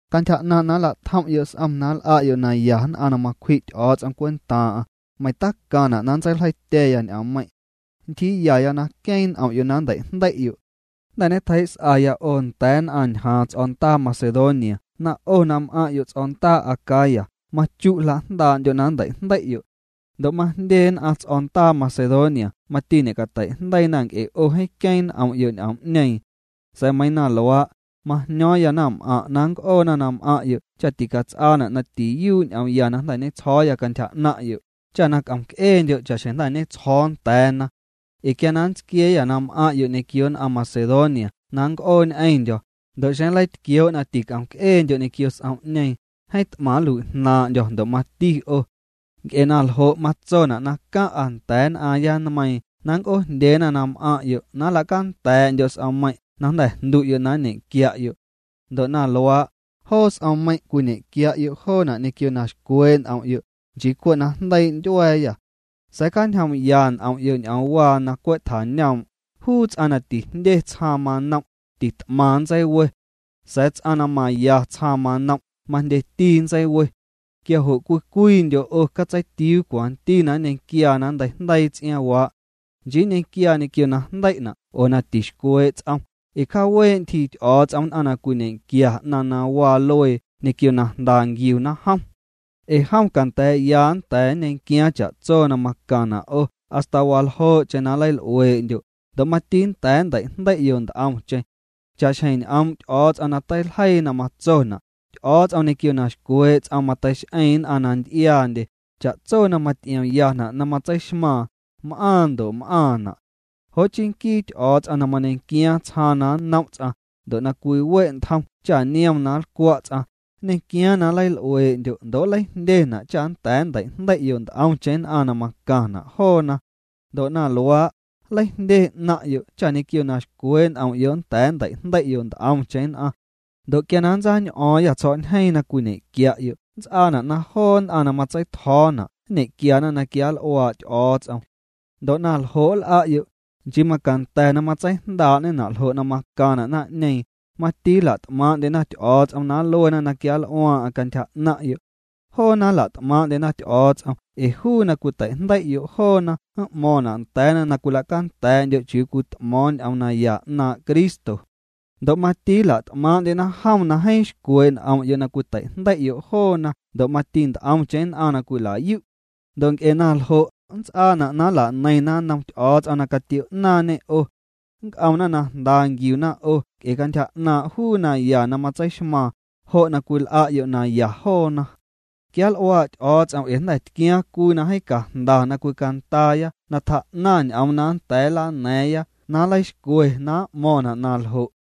Cantyja 'naaⁿ' na nla'tjom'yo' s'om na nl'a'yo' naya nn'aⁿ na macwji' Ty'o̱o̱ts'om cwentaaⁿ'aⁿ, meiⁿ tacaⁿna' na nntseiljeitya̱ya ñ'oommeiⁿ'. Ntyjiiyaya na queeⁿ n'om'yo' na nntei'jndei'yo'. Jnda̱ ñetjeii's'aya 'o nda̱a̱ nn'aⁿ ñjaaⁿ ts'o̱ndaa Macedonia na 'o na m'aⁿ'yo' ts'o̱ndaa Acaya, machu' jla'jndaa'ndyo' na nntei'jndei'yo'. Ndo' majndye nn'aⁿ ts'o̱ndaa Macedonia mati ñe'catei'jndeiina nc'e 'o jeeⁿ queeⁿ n'om'yo' ñ'oom'ñeeⁿ. Sa̱a̱ meiiⁿ na luaa', majño̱o̱ⁿya naⁿm'aⁿ' na nnc'oona na m'aⁿ'yo' cha ticats'aana' na tiyuu' ñ'oom ya na jnda̱ tsjo̱o̱ya cantyja 'naⁿ'yo', cha na c'omc'eendyo' cha'xjeⁿ na jnda̱ tsjo̱o̱ nda̱a̱na. Ee quia na nntsquia̱a̱ya na m'aⁿ'yo' ñequio nn'aⁿ Macedonia na nnc'oo ñ'eⁿndyo̱, ndo' xeⁿ nleitquioo' na tic'omc'eendyo' ñequio s'om'ñeeⁿ, jeeⁿ t'maⁿ nlui'jnaaⁿ'ndyo̱, ndo' mati 'o. Nc'e na ljo' matsona' na caⁿ'a nda̱a̱ nn'aaⁿya nmeiiⁿ na nnc'oojndyeena na m'aⁿ'yo' na nla'canda̱a̱'ndyo' s'ommeiⁿ' na jnda̱ jndu'yo' na nñequia'yo'. Ndo' na luaa', joo s'ommeiⁿ' cwiñequia'yo' joona' ñequio na xcwee' n'om'yo', nchii cwe' na jndeii' ndyua̱a̱yâ. Sa̱a̱ cjaañjoom'ya n'om'yo' ñ'oomwaa na cwe' tjañoom': Juu ts'aⁿ na tijndye tsjaaⁿ manom', tit'maⁿ nntseiwe. Sa̱a̱ ts'aⁿ na maya tsjaaⁿ manom', majndyeti nntseiwe. Quia jo' cwii cwiindyo' 'o catseitiuu cwanti na nñequiaa na nnteijndeii ts'iaaⁿwaa'. Nchii nñequiaa ñequio najndei'na' oo na tixcwee' ts'om, ee cjaawee' ntyjii Ty'o̱o̱ts'om nn'aⁿ na cwiñequia 'naⁿ na waa luee ñequio na jnda nquiuna jom. Ee jom canda̱a̱'ya nnda̱a̱ nñequiaaⁿ cha'tso na macaⁿna' 'o hasta waljoo'cheⁿ na nleil'uee'ndyo', ndo' mati nnda̱a̱ nnteijndei'yo' nt'omcheⁿ. Cha'xjeⁿ ñ'oom' Ty'o̱o̱ts'om na teiljeii na matsona': Ty'o̱o̱ts'om ñequio na xcwee' ts'oom mateix'eeⁿ nn'aⁿ na nty'iaandye, Cha'tso na maty'iomyana' na matseixmaaⁿ, m'aaⁿ ndo' m'aaⁿna'. Jo' chii nquii Ty'o̱o̱ts'om na mañequiaaⁿ tsjaaⁿ na nnom' ts'aⁿ, ndo' na cwiwe' ntjom cha niom na lcwa' ts'aⁿ, nñequiaaⁿ na nleil'uee'ndyo' ndo' nleijndyena' cha nnda̱a̱ nnteijndei'yo' nt'omcheⁿ nn'aⁿ na macaⁿna' joona. Ndo' na luaa', nleijndye 'naⁿ'yo' cha ñequio na xcwee' n'om'yo' nnda̱a̱ nnteijndei'yo' nt'omcheⁿ nn'aⁿ. Ndo' quia na nntsañ'o̱o̱ⁿyâ tsjo̱'ñjeeⁿ na cwiñequia'yo' nnts'aana' na joo nn'aⁿ na matseitjo̱o̱na' nñequiana na quianl'uaa' Ty'o̱o̱ts'om. Ndo' na ljo' nl'a'yo', nchii macanda̱ na matseijndaa'ñena' ljo' na macaⁿna' naⁿ'ñeeⁿ, mati nla't'maaⁿ'ndyena Ty'o̱o̱ts'om na nluena na quianl'uaaⁿ'aⁿ cantyja 'naⁿ'yo'. Joona nla't'maaⁿ'ndyena Ty'o̱o̱ts'om ee juu na cwiteijndei'yo' joona m'mo̱ⁿna' nda̱a̱na na cwilacanda̱a̱'ndyo' chiuu cwit'mo̱o̱ⁿ ñ'oom naya 'naaⁿ' Cristo. Ndo' mati nla't'maaⁿ'ndyena jom na jeeⁿ xcwee' n'om'yo' na cwiteijndei'yo' joona ndo' mati nt'omcheⁿ nn'aⁿ na cwila'yu'. Ndo' nc'e na ljo', nnts'aana' na nla'neiⁿna nnom Ty'o̱o̱ts'om na catio'naaⁿñê 'o. Nnc'omna na jnda nquiuna 'o nc'e cantyja 'naaⁿ' juu naya na matseixmaaⁿ, jo' na cwil'a'yo' naya joona. Quial'uaa' Ty'o̱o̱ts'om ee jnda̱ tquiaaⁿ cwii na jeeⁿ cajnda na cwicandaaya na tjaa'naⁿ ñ'oom na nnda̱a̱ nlana̱a̱ⁿya na nleixcwe na m'mo̱ⁿna' na ljo'.